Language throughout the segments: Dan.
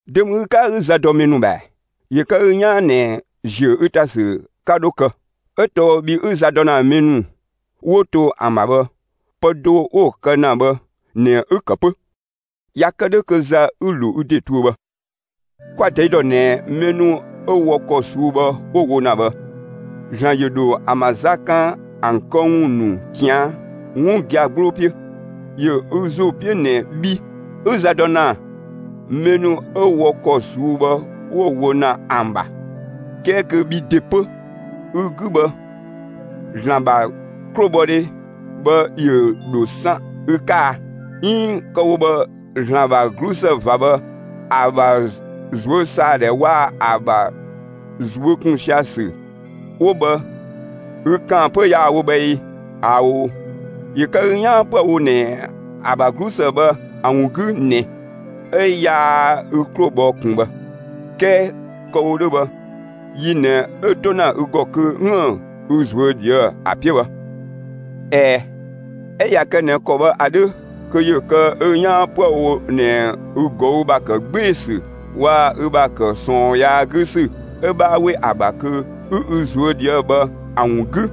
Dö ‑mü ü 'ka 'ü za dɔ mɛ ‑nu ‑bha ‑ɛ? ‑Yö kë ü 'yaan ꞊nɛ ‑ziö ü ‑ta ‑sü 'ka dho kë, 'ö tɔɔ bhi 'ü za dɔ ‑na mɛ ‑nu 'wo to ‑an ‑bha bhë, pë do 'wo‑ kë ‑na bhë ꞊nɛ 'ü‑ ‑kë 'pö; ꞊ya kë 'dhö kö za 'ü‑ ‑lo ü ‑de tuö bhë. Kwa‑ ꞊tɛi' ‑dɔ ꞊nɛ mɛ ‑nu 'ö wɔ ‑kɔ ꞊suu'‑ bhë 'wo‑ wo ‑na bhë, ‑Zlan ‑yö ‑dho ‑an ‑bha za kan ‑an këwun ‑nu ꞊tian' 'wun gia‑ 'gbloo 'piö. ‑Yö ü ‑zo 'piö ꞊nɛ bhi 'ü za dɔ ‑na mɛ ‑nu 'ö wɔ ‑kɔ ꞊suu'‑ bhë 'wo‑ wo ‑na ‑an ‑bha, 'kɛɛ kö bhi ‑de 'pö ü‑ 'gü bhë, ‑Zlan ‑bha 'klobhɔdhe bhë ‑yö ‑dho san ü 'ka a, 'iin kë‑ wo bhë ‑Zlan ‑bha 'glusë ꞊va bhë, ‑a ‑bha ꞊zuösaadhɛ waa‑ ‑a ‑bha ꞊zuö' ‑kun sia‑ ‑sü 'wo bhë, ü ‑kaan 'pö yaa‑ wo bhë ee? ꞊Ao', ‑yö kë ü 'yaan 'püë‑ wo ꞊nɛ ‑a ‑bha 'glusë bhë ‑a ‑wun 'gü ꞊nɛ 'ö yaa ü 'klo bhɔ ꞊kun bhë. 'Kɛɛ kë‑ wo 'dhö bhë, yi ꞊nɛ 'ö‑ 'to ‑na ü ‑gɔ kö 'üën‑ ü ꞊zuö' ꞊dhië'‑ ‑a 'piö bhë. ꞊Ɛɛ, 'ö ꞊ya kë ꞊nɛ ‑kɔ bhë ‑a 'dhö, kö ‑yö kë ü 'yaan 'püë‑ wo ꞊nɛ ü ꞊gɔü' ‑bha ‑kë 'gbee‑ ‑sü waa‑ ü ‑bha ‑kë ꞊sɔɔn yaa 'gü ‑sü 'ö 'bhaa 'we ‑a ‑bha kö 'ü ü ꞊zuö' ꞊dhië' bhë ‑a ‑wun 'gü,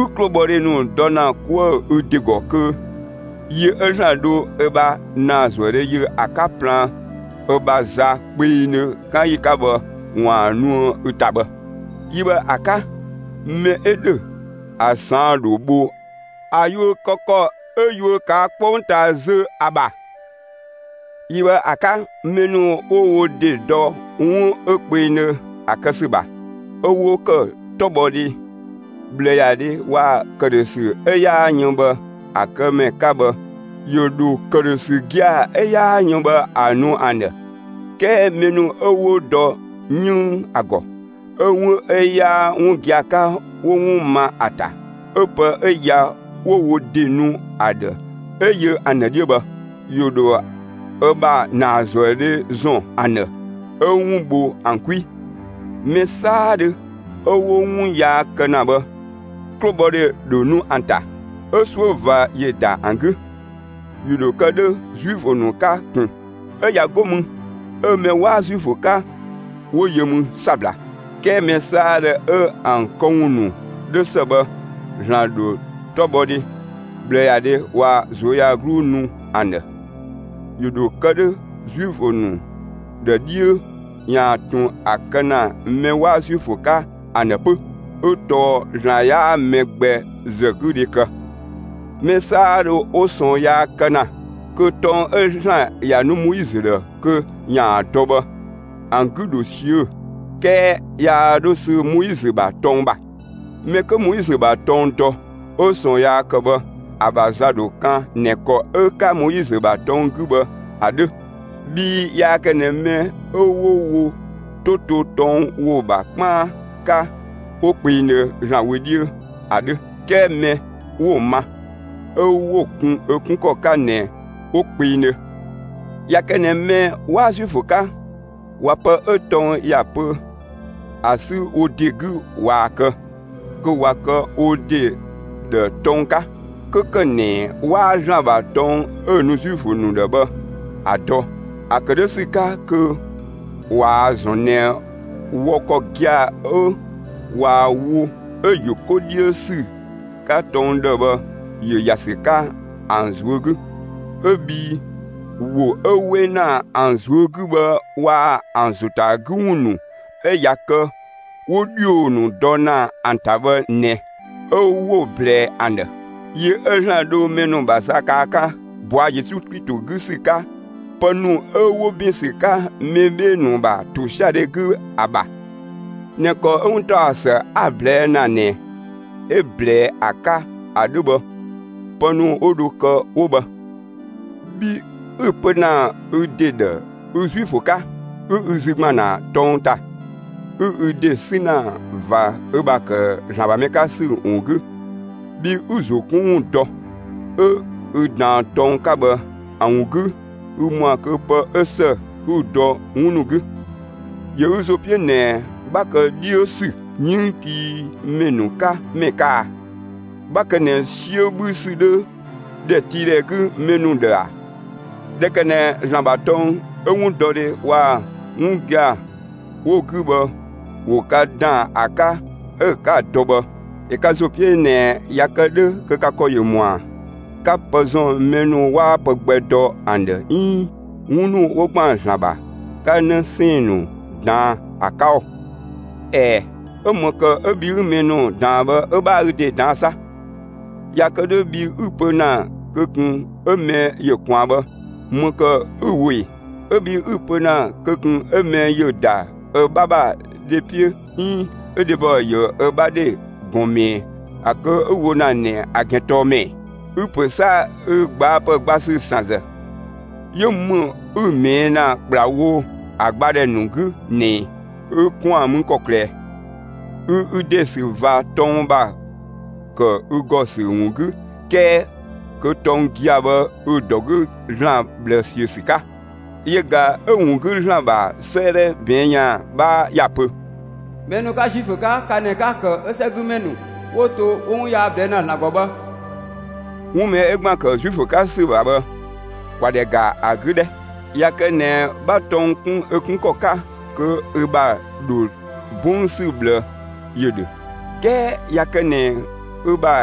ü 'klobhɔdhe ‑nu dɔ ‑na 'kuë‑ ü ‑de ‑gɔ kö yi 'ö ‑Zlan dho ö ‑bha ‑naazuëdhe yö ‑a 'ka plaan ö ‑bha za kpengdhö 'kan ‑yi 'ka bhë ‑waan nuë ü ‑ta bhë. Yi bhë ‑a 'ka, mɛ 'ö ‑dhö, ‑a ꞊saan' ‑dho bho ‑a yuö kë ‑kɔ 'ö yuö ꞊kaa' 'kpongtaa zö ‑a ‑bha. Yi bhë ‑a 'ka, mɛ ‑nu 'wo wo ‑de dɔ 'wun 'ö kpengdhö ‑a kë ‑sü ‑bha, 'ö 'wo ‑kë 'tɔbhɔdhe, ꞊bhlëyadhe waa‑ ‑këdhösü 'ö 'yaa yën bhë ‑a kë ‑mɛ 'ka bhë ‑yö ‑dho ‑këdhösü gia‑ 'ö 'yaa yën bhë ‑a nu ‑an ‑dhë. 'Kɛɛ mɛ ‑nu 'ö 'wo dɔ 'yënng ‑a ‑gɔ, 'ö 'wun 'ö 'yaa 'wun gia‑ 'ka 'wo 'wun ma ‑a ‑ta, 'ö pë 'ö ya, 'wo wo ‑de nu ‑a ‑dhë 'ö yö ‑an ‑dhë 'dhiö bhë, ‑yö ‑dho ö ‑bha ‑naazuëdhe ‑zɔn ‑an ‑dhë 'ö 'wun bho ‑an 'kwi. Mɛ 'saadhö 'ö 'wo 'wun yaa kë ‑na bhë, 'klobhɔdhe ‑dho nu ‑an ‑ta, 'ö 'suö ꞊va ‑yö ‑da ‑an 'gü. ‑Yö ‑dho kë 'dhö Zuifö ‑nu 'ka ꞊kun, 'ö ꞊ya 'go mü 'ö mɛ 'waa Zuifö 'ka 'wo yö mü 'sabla. 'Kɛɛ mɛ 'saadhö 'ö ‑an këwun ‑nu 'dhö ‑së bhë ‑Zlan ‑dho 'tɔbhɔdhe, ꞊bhlëyadhe waa‑ ꞊zuöyagluu nu ‑an ‑dhë. ‑Yö ‑dho kë 'dhö Zuifö ‑nu ‑dhë 'dhiö ‑yaan ꞊tun ‑a kë ‑na mɛ 'waa Zuifö 'ka ‑an ‑dhë 'pö, 'ö tɔɔ ‑Zlan 'yaa mɛ gbɛ ‑zë 'gü dhe kë. Mɛ 'saadhö 'wo ꞊sɔɔn yaa kë ‑na kö tɔng 'ö ‑Zlan ‑ya nu Moizö ‑dhë kö ‑yaan dɔ bhë, ‑an 'gü ‑dho ꞊siö' 'kɛɛ yaa 'dhö sü Moizö ‑bha tɔng ‑bha; mɛ 'kö Moizö ‑bha tɔng dɔ 'ö ꞊sɔɔn yaa kë bhë, ‑a ‑bha za ‑dho kan ꞊nɛ ‑kɔ 'ö‑ 'ka Moizö ‑bha tɔng 'gü bhë ‑a 'dhö. Bhii yaa kë ꞊nɛ mɛ 'ö 'wo wo 'to to tɔng ‑wo ‑bha 'kpaan 'ka 'wo kpengdhö ‑Zlan wö 'dhiö ‑a 'dhö, 'kɛɛ mɛ 'wo‑ ma, 'ö 'wo‑ 'kun ö 'kun ‑kɔ 'ka ꞊nɛ 'wo kpengdhö. ꞊Ya kë ꞊nɛ mɛ 'waa Zuifö 'ka ꞊wa pë 'ö tɔng ‑ya pö ‑a 'sü wo ‑de 'gü ꞊waa‑ kë, kö ꞊wa kë wo ‑de ‑dhë tɔng 'ka, 'kö ‑kë ꞊nɛ 'waa ‑Zlan ‑bha tɔng 'ö‑ nu Zuifö ‑nu ‑dhë bhë ‑a dɔ. ‑A ‑kë 'dhö ‑sü 'ka kö ꞊waa‑ ‑zɔn ꞊nɛ wɔ ‑kɔ gia‑ 'ö ꞊waa‑ wo 'ö ‑yö 'ko 'dhiö ‑sü 'ka tɔng ‑dhë bhë ‑yö ‑ya ‑sü 'ka ‑an ꞊zuö' 'gü; 'ö bhii ‑wo 'ö 'we ‑na ‑an ꞊zuö' 'gü bhë waa‑ ‑an ‑zo ‑ta 'gü ‑wun ‑nu 'ö ꞊ya kë 'wo ‑dhio ‑nu dɔ ‑na ‑an ‑ta bhë ꞊nɛ, 'ö 'wo‑ ꞊blɛɛ ‑an ‑dhë. Yi 'ö ‑Zlan dho mɛ ‑nu ‑bha za kan ‑a 'ka ꞊bɔa' Yesu Klito 'gü ‑sü 'ka, pë ‑nu 'ö 'wo ‑bin ‑sü 'ka mɛ 'bhee‑ ‑nu ‑bha ‑tosiadhe 'gü ‑a ‑bha, ꞊nɛ ‑kɔ 'ö 'wuntaɔsë 'a‑ ꞊blɛɛ' ‑na ꞊nɛ 'ö‑ ꞊blɛɛ ‑a 'ka ‑a 'dhö bhë, pë ‑nu 'wo dho kë 'wo bhë. Bhi 'ü‑ pö ‑na ü ‑de ‑dhë ü Zuifö 'ka, 'ü ü zü ‑gban ‑na tɔng ‑ta, 'ü ü ‑de 'sü ‑na ꞊va ü ‑bha ‑kë ‑Zlan ‑bha mɛ 'ka ‑sü ‑wun 'gü, bhi 'ü‑ ‑zo 'kun ‑wun dɔ, 'ö ü ꞊daan tɔng 'ka bhë ‑a ‑wun 'gü 'ü ‑mɔa kö pë 'ö ‑së 'ü‑ dɔ 'wun ‑nu 'gü, ‑yö ü ‑zo 'piö ꞊nɛ 'bha kë 'dhiö ‑sü 'yënngtiimɛ ‑nu 'ka ‑mɛ 'ka a? 'Bha kë ꞊nɛ 'siö 'bhü ‑sü 'dhö ‑dhɛtiidhɛ 'gü mɛ ‑nu ‑dhë ‑a? ꞊Dhɛ ‑kë ꞊nɛ ‑Zlan ‑bha tɔng 'ö 'wundɔdhe waa‑ 'wun gia‑ 'wo‑ 'gü bhë ‑wo ka ‑daan ‑a 'ka 'ö 'ka‑ dɔ bhë, ‑yö ka ‑zo 'piö ꞊nɛ ꞊ya kë 'dhö kö ka ‑kɔ ‑yö ‑mɔa 'ka pë ‑zɔn mɛ ‑nu 'waa pë gbɛ dɔ ‑an ‑dhë 'iin 'wun ‑nu 'wo ‑gban ‑Zlan ‑bha, 'ka 'në 'sɛɛn‑ ‑nu ꞊daan ‑a 'ka ‑oo? ꞊Ɛɛ, 'ö ‑më ‑kë 'ö bhi 'ü mɛ ‑nu ꞊daan bhë 'ö 'bhaa ü ‑de ꞊daan'‑ 'sa? ꞊Ya kë 'dhö bhi 'ü‑ pö ‑na kö ꞊kun 'ö mɛ ‑yö ꞊kwaan bhë, ‑më ‑kë 'ü‑ wo ꞊ee? 'Ö bhi 'ü‑ pö ‑na kö ꞊kun 'ö mɛ ‑yö ‑da ö 'bha ‑bha dhe 'piö 'iin 'ö dhebɔ ‑yö ö 'bha dhe ꞊gɔn ꞊mɛɛ'‑, ‑a kë 'ü‑ wo ‑na ꞊nɛ ‑a ‑gɛn tɔɔ ‑më ‑ɛ? Ü‑ ‑pö 'sa ü gbaapë gba ‑sü ‑san ‑zë, 'yö ‑më 'ü‑ ꞊mɛɛ' ‑na ‑kplawo ‑an gbadhɛ ‑nu 'gü ꞊nɛ ꞊ɛ? Ü ‑kwaan mü ‑kɔklë ꞊ɛ? Ü ü ‑de ‑sü ꞊va tɔng ‑bha ‑kë ü ‑gɔ ‑sü ‑wun 'gü 'kɛɛ kö tɔng gia‑ bhë ü‑ ‑dɔ 'gü ‑Zlan ꞊bhlë ‑siö ‑sü 'ka. Yö ꞊ga 'ö‑ ‑wun 'gü ‑Zlan ‑bha 'sëëdhɛ ꞊bɛɛn' ‑yan 'bhaa ‑ya ‑pö: Mɛ 'ka Zuifö 'ka, ka ꞊nɛ 'ka‑ ‑kë 'ö 'sɛgümɛ ‑nu 'wo to 'ö 'wo 'wun yaa ꞊blɛɛ' ‑na ‑Zlan ‑gɔ bhë. 'Wun mɛ 'ö ‑gban ‑kë Zuifö 'ka ‑sü ‑bha bhë, ‑kwa ‑dhɛ ‑ga ‑a 'gü 'dhɛ! ꞊Ya kë ꞊nɛ 'bha tɔng 'kun ö 'kun ‑kɔ 'ka, kö ü ‑bha ‑dho 'bɔng ‑sü ꞊bhlë ‑yö ‑dhö; 'kɛɛ ꞊ya kë ꞊nɛ ü ‑bha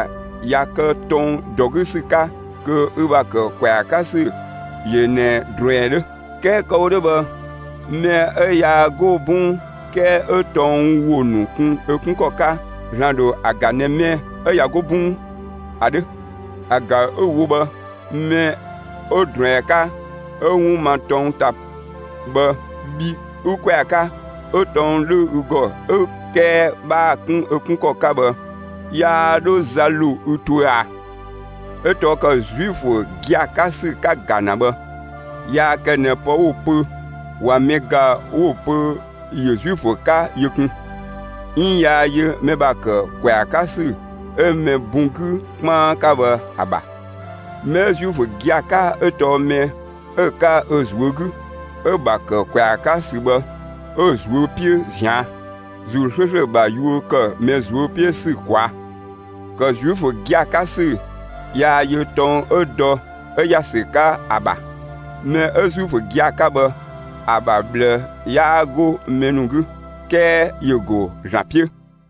꞊ya kë tɔng ‑dɔ 'gü ‑sü 'ka, kö ü ‑bha ‑kë ‑kwɛa 'ka ‑sü ‑yö ꞊nɛ ꞊druɛn 'dhö. 'Kɛɛ kë‑ wo 'dhö bhë, mɛ 'ö yaa 'go 'bɔng 'kɛɛ 'ö tɔng ‑wo ‑nu kun ö 'kun ‑kɔ 'ka, ‑Zlan ‑dho ‑a ‑ga ꞊nɛ mɛ 'ö ꞊ya 'go 'bɔng ‑a 'dhö. ‑A ‑ga 'ü‑ wo bhë, mɛ 'ö ꞊druɛn 'ka 'ö 'wun ma tɔng ‑ta bhë, bhi 'ü ‑kwɛa 'ka, 'ö tɔng 'dhö ü ‑gɔ 'ö 'kɛɛ 'bhaa‑ 'kun ö 'kun ‑kɔ 'ka bhë, yaa 'dhö za ‑lo ü tuö ꞊a? 'Ö tɔɔ ‑kë Zuifö gia‑ 'ka ‑sü 'ka‑ ‑ga ‑na bhë yaa kë ꞊nɛ pë 'wo‑ pö ꞊wa mɛ ‑ga 'wo‑ pö ‑yö Zuifö 'ka yö kun, 'iin yaa yö mɛ ‑bha ‑kë ‑kwɛa 'ka ‑sü 'ö mɛ bun 'gü 'kpaan 'ka bhë ‑a ‑bha. Mɛ 'ö Zuifö gia‑ 'ka 'ö tɔɔ mɛ 'ö‑ 'ka ö ꞊zuö' 'gü, 'ö‑ ‑bha ‑kë ‑kwɛa 'ka ‑sü bhë, 'ö‑ ꞊zuö' 'piö ꞊zian', ‑Zuu 'slööslö ‑bha yuö kë mɛ ꞊zuö' 'piö ‑sü ꞊kwaa'; ‑kë Zuifö gia‑ 'ka ‑sü yaa yö tɔng 'ö dɔ 'ö ‑ya ‑sü 'ka ‑a ‑bha. Mɛ 'ö Zuifö gia‑ 'ka bhë, ‑a ‑bha ꞊bhlë 'yaa 'go mɛ ‑nu 'gü, 'kɛɛ ‑yö ‑go ‑Zlan 'piö.